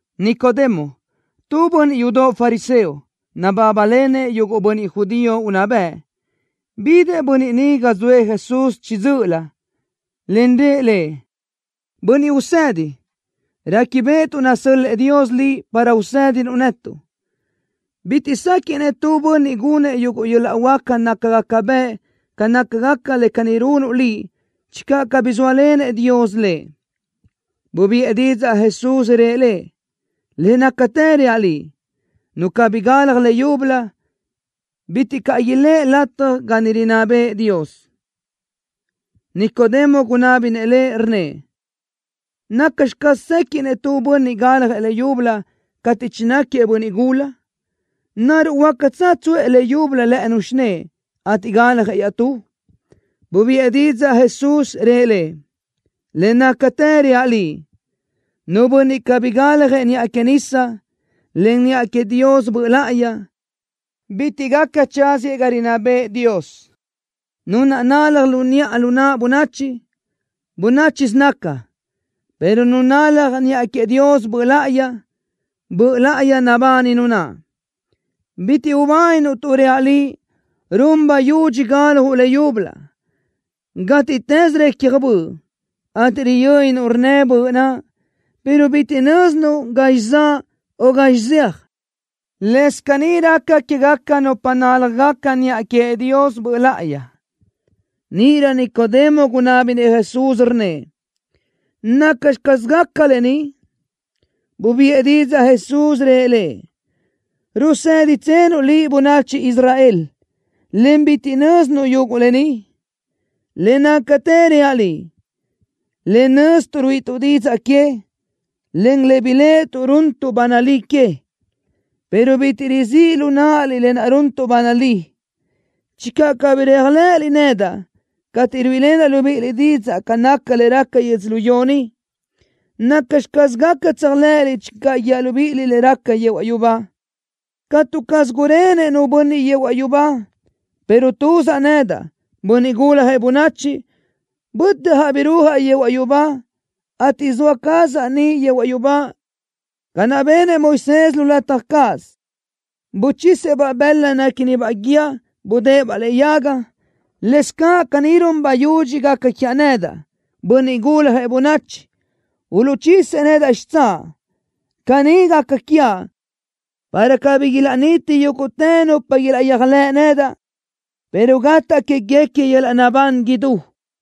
Nicodemo, tu bönniʼ yudoʼ fariseo, nabábalenëʼ yuguʼ bönniʼ judío unná bëʼ. Bidëʼ bönniʼ ni ga zoëʼ Jesús chiʼi dzö́ʼölö, en rëʼ Lëʼ: —Bönniʼ Usedi. Réquibeʼetuʼ nasö́l-lëʼë Dios Liʼ para usédinuʼ netuʼ. Bitiʼ séquiʼnëʼ tu bönniʼ gunëʼ yuguʼ yöl-laʼ huáca nácagaca bëʼ ca nácagaca le caní runuʼ Liʼ channö cabí zóalenëʼ Dios lëʼ. Bubiʼë didzaʼ Jesús, rëʼ lëʼ: —Le nácatë reaʼ liʼ, nu cabí galaj leyúbölö, bitiʼ caʼ iléʼe lataj ga niʼ rinná bëʼë Dios. Nicodemo gunábinëʼ Lëʼ, rnnëʼ: —¿Nacxi caz séquiʼnëʼ tu bönniʼ galjëʼ leyúbölö cateʼ chináquiëʼ bönniʼ gula? ¿Naruʼ huácatsö tsuʼë leyúbölö lë́ʼënu xinë́ʼë, ateʼ galjëʼ iaʼtú? Bubiʼë didzaʼ Jesús, rëʼ lëʼ: —Le nácatë reaʼ liʼ. Nu bönniʼ cabí galjëʼ niʼa que nisa, en niʼa queëʼ Dios Böʼ Láʼayi, bitiʼ gaca tsáziëʼ ga rinná bëʼë Dios. Nu naʼ nalaj lu niʼa lu naʼ bönachi, bönáchisö naca, pero nu nalaj niʼa queëʼ Dios Böʼ Láʼayi, Böʼ Láʼayi nabani nu naʼ. Bitiʼ ubáninuʼ tuʼ reaʼ liʼ, run bayudxi galjuʼ leyúbölö. Gátiʼtës recja böʼ, ateʼ riyönnuʼ rnnë böʼ naʼ, pero bitiʼ nö́zinuʼ gazxi zaʼ, o gazxi zeaj. Lëscaʼ caní raca quégaca nupa náljagaca niʼa queëʼ Dios Böʼ Láʼayi. Níʼirö Nicodemo gunábinëʼ Jesús, rnnëʼ: —¿Nacxi caz gaca lë ni? Bubiʼë didzaʼ Jesús, rëʼ lëʼ: —¿Ruséditsenuʼ liʼ bönachi Israel, en bitiʼ nö́zinuʼ yuguʼ lë ni? Le nácatë reaʼ liʼ, le nöztuʼ ruíʼituʼ didzaʼ que, en le biléʼetuʼ runtuʼ ba nalí que, pero bitiʼ rizíʼ lu náʼaliʼ lë naʼ runtuʼ ba nalí. Channö cabí réajlëʼëliʼ nedaʼ cateʼ ruíʼilenaʼ libíʼiliʼ didzaʼ ca naca le raca yödzölió ni, ¿nacxi caz gaca tséajlëʼëliʼ channö guíaʼ libíʼiliʼ le raca yehuaʼ yubá? ’Catu caz gurenëʼ nu bönniʼ yehuaʼ yubá, pero tuzaʼ nedaʼ, Bönniʼ Guljëʼ Bönachi, bötjaʼ birúajaʼ yehuaʼ yubá, ateʼ zoa cazaʼ niʼ yehuaʼ yubá. Ca naʼ benëʼ Moisés lu lataj cáʼasö, buchisëʼ-baʼ bëla néquinibaʼ guíë, budë́ʼë-baʼ lëʼe yaga, lëscaʼ caní run bayudxi gaca quiaʼ nedaʼ, Bönniʼ Guljëʼ Bönachi, uluʼchisëʼ nedaʼ xitsáʼ. Caní gaca quiaʼ, para cabí ilaʼniti yúguʼtë nupa ilaʼyéajlëʼ nedaʼ, pero gataʼ quéguequi yöl-laʼ naʼbán idú.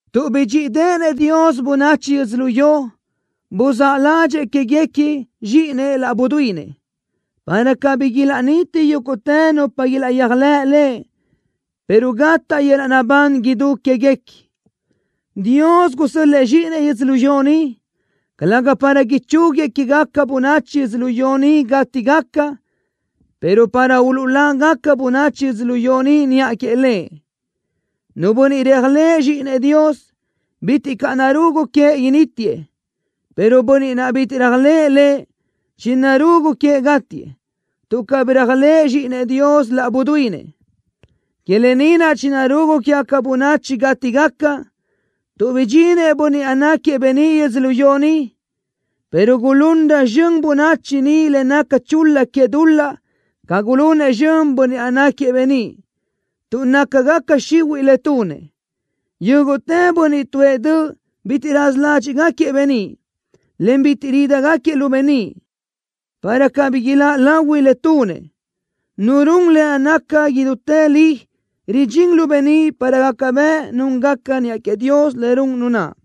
Tuʼ bidxíʼideʼenëʼ Dios bönachi yödzölió, buzáʼ ládxëʼë quéguequi Zxíʼinëʼ laʼ buduínëʼ, para cabí ilaʼniti yúguʼtë nupa ilaʼyéajlëʼ Lëʼ, pero gataʼ yöl-laʼ naʼbán idú quéguequi. Dios gusö́l-lëʼë Zxíʼinëʼ yödzölió ni, calëga para ichúguiëʼ quégaca bönachi yödzölió ni gátigaca, pero para uluʼlágaca bönachi yödzölió ni niʼa queëʼ Lëʼ. Nu bönniʼ réajlëʼë Zxíʼinëʼ Dios, bitiʼ caʼ narugu queëʼ inítiëʼ, pero bönniʼ naʼ bitiʼ réajlëʼë Lëʼ, chinarugu queëʼ gátiëʼ, tuʼ cabí réajlëʼë Zxíʼinëʼ Dios laʼ buduínëʼ. Que lë ni naʼ chinarugu quégaca bönachi gátigaca, tuʼ bidxinëʼ Bönniʼ naʼ náquiëʼ beníʼ yödzölió ni, pero gulunrö zxön bönachi ni le naca chul-la que dul-laʼ ca gulunëʼ zxön Bönniʼ naʼ náquiëʼ beníʼ, tuʼ nácagaca xihuiʼ le tunëʼ. Yúguʼtë bönniʼ tuʼë döʼ bitiʼ raza ládxiʼgaquiëʼ beníʼ, en bitiʼ rídigaquiëʼ lu beníʼ, para cabí iláʼ lahui le tunëʼ. Nu run le naca idútë li ridxín lu beníʼ para gaca bëʼ núngaca niʼa queëʼ Dios le run nu naʼ.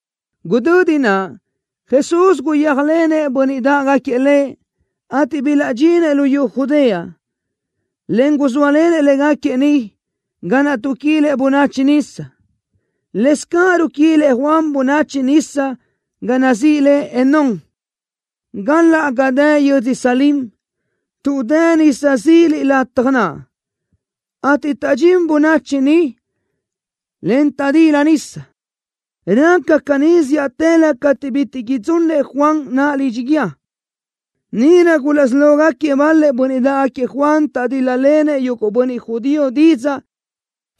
Gudödi naʼ, Jesús guyéajlenëʼ bönniʼ dáʼgaquiëʼ Lëʼ, ateʼ bilaʼdxinëʼ luyú Judea, en guzóalenëʼ légaquiëʼ niʼ, ga naʼ tuʼquilëʼ bönachi nisa. Lëscaʼ ruquilëʼ Juan bönachi nisa ga nazíʼi le Enón, galaʼ ga dë yödzö Salim, tuʼ dë nisa zila lataj naʼ, ateʼ taʼdxín bönachi niʼ, en taʼdila nisa. Raca caní zíʼatëlö cateʼ bitiʼ idzunëʼ Juan naʼ lidxi guíë. Níʼirö gulaʼsí lógaquiëʼ bal-lëʼ bönniʼ dáʼgaquiëʼ Juan taʼdíl-lalenëʼ yuguʼ bönniʼ judío didzaʼ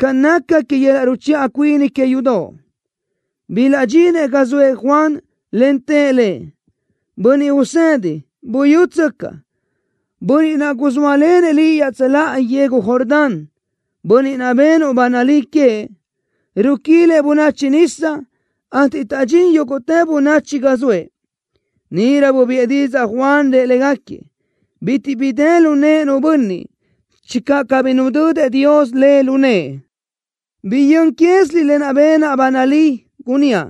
ca naca que yöl-laʼ ruchiʼa cuini que yudoʼ. Bilaʼdxinëʼ ga zoëʼ Juan, en tëʼ lëʼ: —Bönniʼ usedi. Buyútsöcaʼ. Bönniʼ naʼ guzóalenëʼ liʼ iaʼtsöláʼa yegu Jordán, bönniʼ naʼ benuʼ ba nalí queëʼ, ruquilëʼ bönachi nisa, ateʼ taʼdxín yúguʼtë bönachi ga zoëʼ. Níʼirö bubiʼë didzaʼ Juan, rëʼ légaquiëʼ: —Bitiʼ bi dë lu nëʼë nu bönniʼ, channö cabí nudödëʼ Dios le lu nëʼë. Biyö́n quéziliʼ lë naʼ benaʼ ba nalí, gunníaʼ: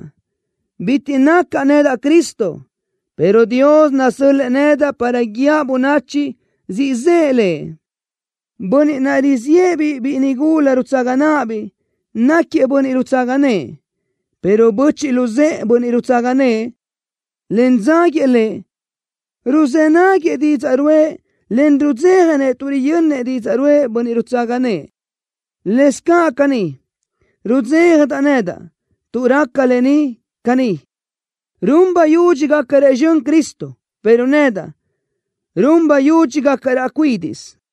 “Bitiʼ nacaʼ nedaʼ Cristo”, pero Dios nasö́l-lëʼë nedaʼ para guíaʼ bönachi siʼ zëʼë Lëʼ. Bönniʼ naʼ riziʼë-biʼ biʼi nigula rutsaga náʼabiʼ náquiëʼ bönniʼ rutsaga nëʼë, pero böchiʼ luzë́ʼë bönniʼ rutsaga nëʼë, en dzáguiëʼ lëʼ, ruzë́ náguiëʼ didzaʼ ruʼë, en rudzéjanëʼ tuʼ riyönnëʼ didzaʼ ruʼë bönniʼ rutsaga nëʼë. Lëscaʼ caní, rudzéjadeʼedaʼ nedaʼ tuʼ raca lë ni caní. Run bayudxi gácarëʼ zxön Cristo, pero nedaʼ, run bayudxi gácaraʼ cuídiʼsö.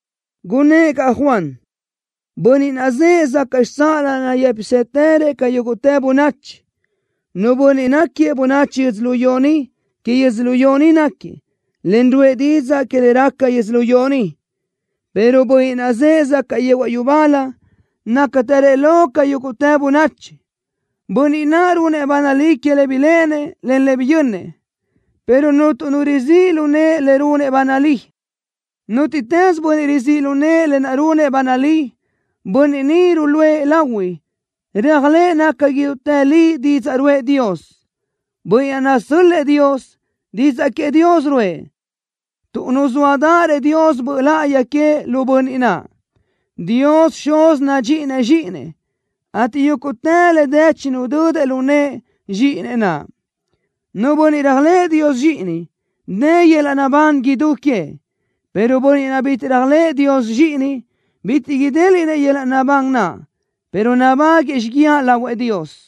Gunnë́ʼ caʼ Juan: —Bönniʼ naʼ zëʼë zacaʼ xitsáʼalö nayë́pisëtërëʼ ca yúguʼtë bönachi. Nu bönniʼ náquiëʼ bönachi yödzölió ni, que yödzölió ni náquiëʼ, en ruʼë didzaʼ que le raca yödzölió ni, pero Bönniʼ naʼ zëʼë zacaʼ yehuaʼ yubálö nácatërëʼ lo ca yúguʼtë bönachi. Bönniʼ naʼ runëʼ ba nalí que le biléʼenëʼ, en le biyönnëʼ, pero cuntu nu rizíʼ lu nëʼe le runëʼ ba nalí. Nútiʼtës bönniʼ rizíʼ lu nëʼë lë naʼ runëʼ ba nalí, bönniʼ ni ruluʼë lahui réajlëʼë naca idútë li didzaʼ ruʼë Dios. Bönniʼ naʼ nasö́l-lëʼë Dios, didzaʼ queëʼ Dios ruʼë, tuʼ nuzóadërëʼ Dios Böʼ Láʼayi queëʼ lu Bönniʼ naʼ. Dios Xuz nadxíʼinëʼ Zxíʼinëʼ, ateʼ yúguʼtë le dë chinudödëʼ lu nëʼë Zxíʼinëʼ naʼ. Nu bönniʼ réajlëʼë Dios Zxíʼini, dë yöl-laʼ naʼbán idú queëʼ, pero bönniʼ naʼ bitiʼ réajlëʼë Dios Zxíʼini, bitiʼ idéliʼnëʼ yöl-laʼ naʼbán naʼ, pero nabáguëʼë xíguiaʼ lahuëʼ Dios.